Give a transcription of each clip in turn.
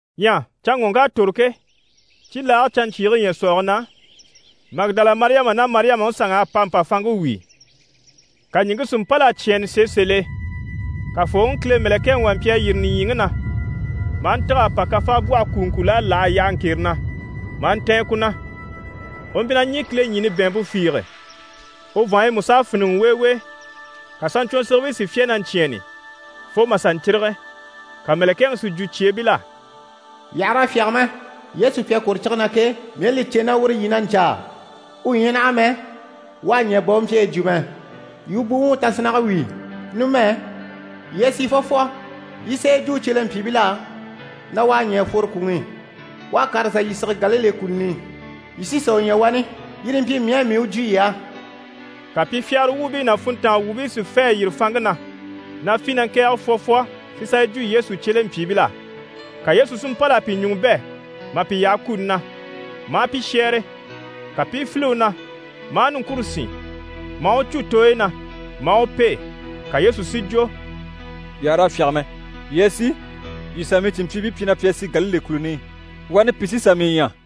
Ɲyɛ canŋɔŋk'à tòro ke, cibilaage canɲcyiige ɲyɛ̀sɔɔge na, Magidala Mariyama ná Mariyamaŋi sanŋ'à pa mpa fanŋke wíi. Ka ɲìŋke si mpâl'a cyɛ̂ɛnnɛ sèe sèl'e. Kafooŋi Kile mɛ̀lɛkɛŋi wà mpyi a yîri nìɲyiŋi na, maa ntîg'a pa kafaabwɔhe kùuŋkul'a láha a yaha ŋkere na, maa ntɛ̀ɛn ku na. U mpyi na ɲî kileɲini bɛ̀ɛnmpe fiige, u vàanɲyi mú s'à fíniŋɛ weewee. Ka saɲcwɔnsigibii si fyá na ɲcyɛ̂ɛnni, fo mà sà ɲcírige. Ka mɛ̀lɛkɛŋi si jwo cyeebil'á: «Yii àha raa fyáge mɛ. Yesu pi à kwòro cige na ke, mii à li cè na uru yii na ɲcaa. U ɲyɛ naha mɛ, u à ɲɛ̀ bà u mpyi a yi jwo mɛ! Yii u buwuŋi tasinnage wíi! Numɛ, yii a sì fwɔfwɔ, yii i sà yi jwo u cyelempyiibil'á na “U à ɲɛ̀ a fworo kwùŋi i. U à kàr'a sà yii sige Galile kùluni i. Yii sí sà u ɲya wani.” Yire yi mpyi mii á, mii u jwo yii á.» Ka pi fyagara wuubii ná funntanga wuubii si fê a yîri fanŋke na, na fî na ŋkɛ̀ɛge fwɔfwɔ si sà yi jwo Yesu cyelempyiibil'á. Ka Yesu si mpâl'a pi ɲùŋɔ bɛ̂ mà pi yaha kuni na, maa pi shɛ́ɛre. Ka pi i file u na, maa niŋkure sín, maa u cû tooyi na, maa u pêe. Ka Yesu si jwo: «Yii àha raa fyáge mɛ. Yii a sì, yii sà mii cìnmpyiibii pyi na pi a sì Galile kùluni i. Wani pi sí sà mii ɲya.»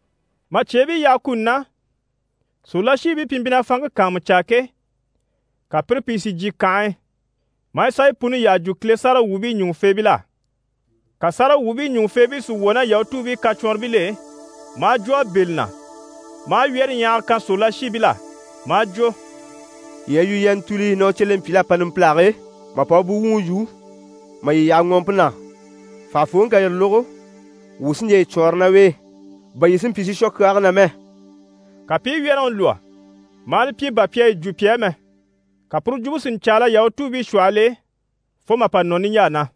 Mà cyeebii yaha kuni na, sòrolashiibii pi mpyi na fanŋke kàanmucaa ke, ka pire pìi si jyè kànhe e, mà sà yi puni yyaha jwo Kile sáragawwuubii ɲùŋufeebil'á. Ka sáragawwuubii ɲùŋufeebii si wwɔ̀ ná Yahutuubii kacwɔnribil'e, maa jwo a bɛ̂ li na, maa wyɛ́rɛɲyahaga kan sòrolashiibil'á, maa jwo: «Yii a yi yu yii a ntùuli na u cyelempyiibil'à pa numpilage e, mà pa u buwuŋi yû, mà yii yaha ŋɔɔmpe na. Fànhafooŋi ká yire lógo, wuu sí n‑jà yi cwɔɔnrɔ ná u e, bà yii si mpyi si shwɔ kyaage na mɛ.» Ka pi i wyɛ́rɛŋi lwɔ́, maa li pyi bà pi à yi jwo pi á mɛ. Ka puru jwumpe si ɲcaala Yahutuubii shwɔhɔl'e fo mà pa nɔ niɲjaa na.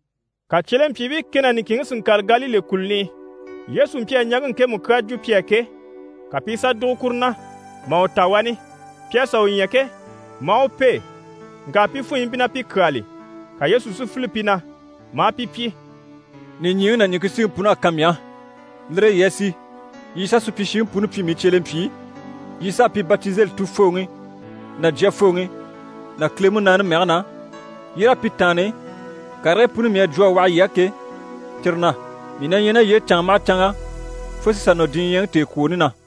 Ka cyelempyiibii kɛ ná niŋkinŋi si ŋkàre Galile kùluni i. Yesu mpyi a ɲàŋke ŋkemu kyaa jwo pi á ke, ka pi i sà dùgo kuru na, mà u ta wani. Pi à sà u ɲya ke, maa u pêe, ŋka pi pìi funyɔ mpyi na pi kyáali. Ka Yesu si file pi na, maa pi pyi: «Nìɲyiŋi ná ɲìŋke síŋi pun'à kan mii á. Lire e yii a sì yii sà supyishiŋi puni pyi mii cyelempyii, yii s'a pi batizeli Tufooŋi ná Jyafooŋi ná Kile Munaani mɛge na, yii raa pi taanni karigii puni mii à jwo a waha yii á ke, cyire na. Mii na ɲyɛ ná yii e canŋa maha canŋa fo si sà nɔ diɲyɛŋi tèekwooni na.»